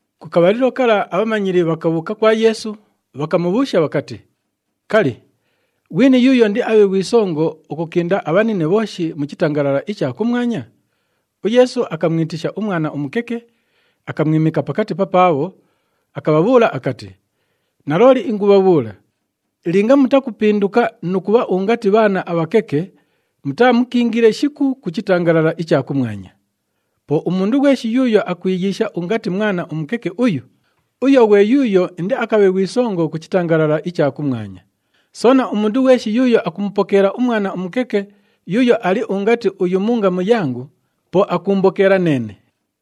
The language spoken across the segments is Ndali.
Ku kabhalilo kala abhamanyili bhakabhuuka kwa Yeesu, bhakamubhuusha bhakati, “Kali, ghwini yuuyo indiabhe ghwi songo ukukinda abhanine bhooshi mu chitangalala icha kumwanya?” UYeesu akamwitisha umwana umukeke, akamwimika pakati papaabho, akabhabhuula akati, “Nalooli ingubhabhuula, linga mutakupinduka nu kubha ungati bhaana abhakeke, mutaamukiingile shiku ku chitangalala icha kumwanya. Po umundu ghweshi yuuyo akwiyiisha ungati mwana umukeke uyu, uyo ghwe yuuyo indiakabhe ghwi songo ku chitangalala icha kumwanya. Soona, umundu ghweshi yuuyo akumupokeela umwana umukeke yuuyo ali ungati uyu mu ngamu yangu, po akuumbokeela neene.”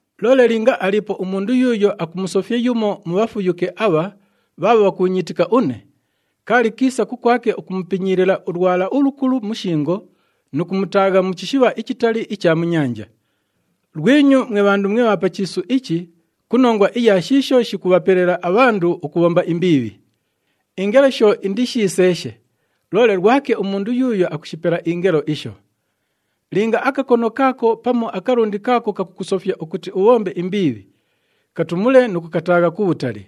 “Loole linga aliipo umundu yuuyo akumusofya yumo mu bhafuyuke abha bhaabho bhakuunyiitika une, kaali kiisa kukwake ukumupinyiilila ulwala ulukulu mu shingo nu kumutaagha mu chishibha ichitali icha mu nyanja. Lwinyu mwe bhandu mwe bha pa chiisu ichi ku nongwa iya shiisho shikubhapelela abhandu ukubhomba imbiibhi! Ingelo sho indishiseeshe, loole lwake umundu yuuyo akushipela ingelo isho! Linga akakono kaako pamu akalundi kaako kakukusofya ukuti ubhombe imbiibhi, katumule nu kukataagha kubhutali.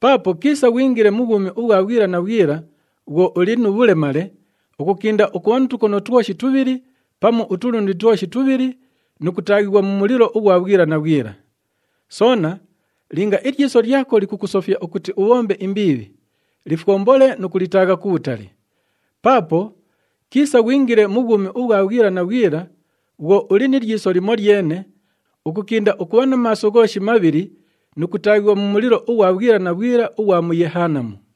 Paapo kiisa ghwingile mu bhwumi ubhwa bhwila na bhwila bhwo uli nu bhulemale, ukukinda ukubha nu tukono twoshi tubhili pamu utulundi twoshi tubhili nu kutaaghighwa mu mulilo ughwa bhwila na bhwila. Soona linga ilyiso lyako likukusofya ukuti ubhombe imbiibhi, lifwombole nu kulitaagha kubhutali! Paapo kiisa ghwingile mu bhwumi ubhwa bhwila na bhwila bhwo uli ni lyiso limolyene, ukukinda ukubha na maaso ghooshi mabhili nu kutaaghighwa mu mulilo ughwa bhwila na bhwila ughwa mu Yehanamu.”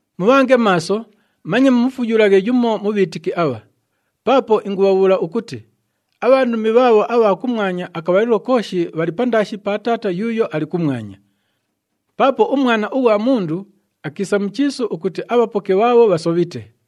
“Mubhange maaso, manye mumufuyulaghe yumo mu bhiitiki abha! Paapo ingubhabhuula ukuti abhandumi bhaabho abha kumwanya akabhalilo kooshi bhali pandaashi pa Taata yuuyo ali kumwanya. [ Paapo uMwana ughwa Mundu akiisa mu chiisu ukuti abhapoke bhaabho bhasobhite.]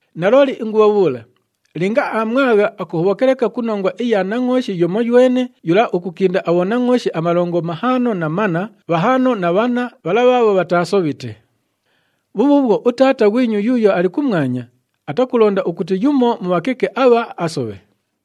Nalooli ingubhabhuula, linga aamwagha, akuhobhoka leka ku nongwa iya nangʼooshi yumoywene yula ukukinda abhonangʼooshi amalongo mahaano na manna, bhahaano na bhanna bhala bhaabho bhataasobhite. Bhubhuubhwo, uTaata ghwinyu yuuyo ali kumwanya atakulonda ukuti yumo mu bhakeke abha asobhe.”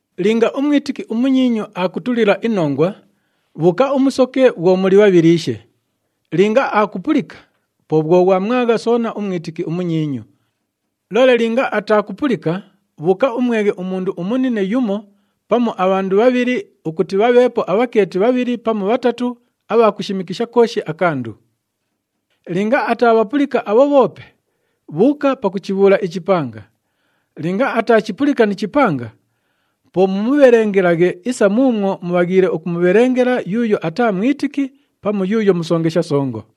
“Linga umwitiki umunyiinyu aakutulila inongwa, bhuuka umusoke bhwo muli bhabhiliishe. Linga aakupulika, po bhwo ghwamwagha soona umwitiki umunyiinyu. Loole linga ataakupulika, bhuuka umweghe umundu umunine yumo pamu abhandu bhabhili ukuti ‘bhabheepo abhakeeti bhabhili pamu bhatatu abha kushimikisha kooshi akandu.’ Linga ataabhapulika abho bhoope, bhuuka pakuchibhuula ichipanga. Linga ataachipulika ni chipanga, po mumubhelengelaghe isa muumwo mubhaghiile ukumubhelengela yuuyo ataa mwitiki pamu yuuyo musongesha songo.”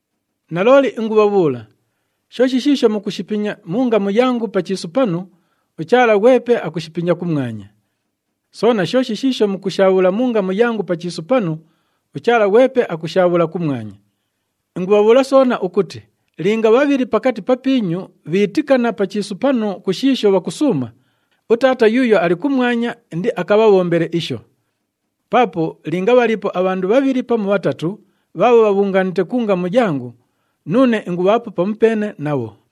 “Nalooli ingubhabhuula, shooshi shiisho mukushipinya mu ngamu yangu pa chiisu panu, uChaala ghwepe akushipinya kumwanya. Soona shooshi shiisho mukushaabhula mu ngamu yangu pa chiisu panu, uChaala ghwepe akushaabhula kumwanya. Ingubhabhuula soona ukuti linga bhabhili pakati papiinyu bhiitikana pa chiisu panu ku shiisho bhakusuuma, uTaata yuuyo ali kumwanya indiakabhabhombele isho. Paapo linga bhaliipo abhandu bhabhili pamu bhatatu bhaabho bhabhungaanite ku ngamu yangu, nuune ingubhaapo pamupeene nabho.”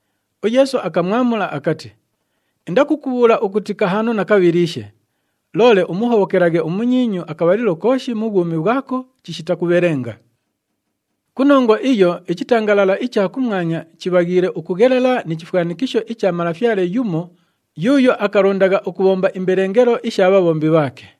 UYeesu akamwamula akati, “Indakukubhuula ukuti kahaano na kabhiliishe, loole umuhobhokelaghe umunyiinyu akabhalilo kooshi mu bhwumi bhwako chishita kubhelenga. “Ku nongwa iyo ichitangalala icha kumwanya chibhaghiile ukughelela ni chifwanikisho icha malafyale yumo yuuyo akalondagha ukubhomba imbelengelo isha bhabhombi bhaake.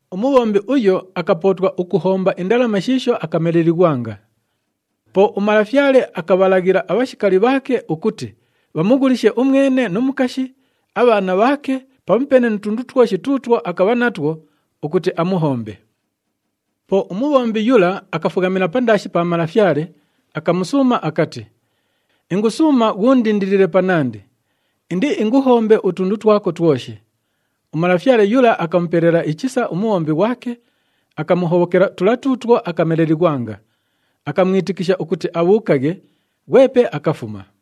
Umubhombi uyo akapootwa ukuhomba indalama shiisho akamelelighwanga. Po umalafyale akabhalaghila abhashikali bhaake ukuti bhamughulishe umwene nu mukashi, abhaana bhaake pamupeene nu tundu twoshi tuutwo akabha natwo ukuti amuhombe. “Po umubhombi yula akafughamila pandaashi pa malafyale, akamusuuma akati, ‘Ingusuuma ghuundindilile panandi, indiinguhombe utundu twako twoshi.’ Umalafyale yula akamupelela ichisa umubhombi ghwake, akamuhobhokela tula tuutwo akamelelighwanga, akamwitikisha ukuti abhuukaghe, ghwepe akafuma.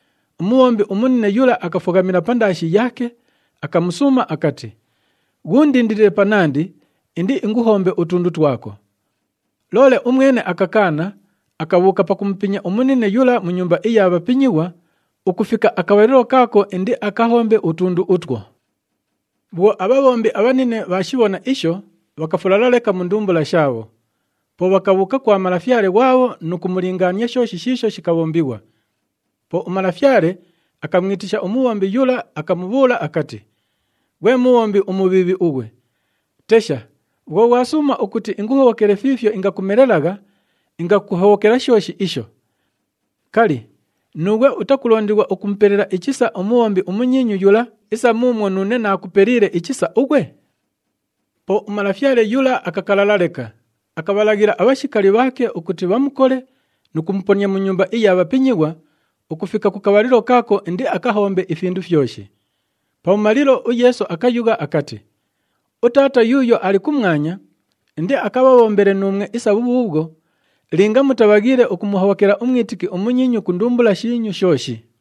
Umubhombi umunine yula akafughamila pandaashi yaake, akamusuuma akati, ‘Ghuundindilile panandi, indiinguhombe utundu twako.’ Loole umwene akakaana, akabhuuka pakumupinya umunine yula mu nyumba iya bhapinyighwa ukufika ku kabhalilo kaako indiakahombe utundu utwo. “Bhwo abhabhombi abhanine bhaashibhona isho, bhakafulala leka mu ndumbula shaabho. Po bhakabhuuka kwa malafyale ghwabho nu kumulingaania shooshi shiisho shikabhombighwa. Po umalafyale akamwitisha umubhombi yula, akamubhuula akati, ‘Ghwe mubhombi umubhiibhi ughwe! Tesha, bhwo ghwasuuma ukuti inguhobhokele fiifyo ingakumelelagha, ingakuhobhokela shooshi isho! Kali, nuughwe utakulondighwa ukumupelela ichisa umubhombi umunyiinyu yula isa muumwo nuune naakupeliile ichisa ughwe?’ “Po umalafyale yula akakalala leka, akabhalaghila abhashikali bhaake ukuti bhamukole nu kumuponia mu nyumba iya bhapinyighwa ukufika ku kabhalilo kaako indiakahombe ifindu fyoshi.” Pabhumalilo, uYeesu akayugha akati, “UTaata yuuyo ali kumwanya indiakabhabhombele nuumwe isa bhubhuubhwo linga mutabhaghiile ukumuhobhokela umwitiki umunyiinyu ku ndumbula shiinyu shooshi.”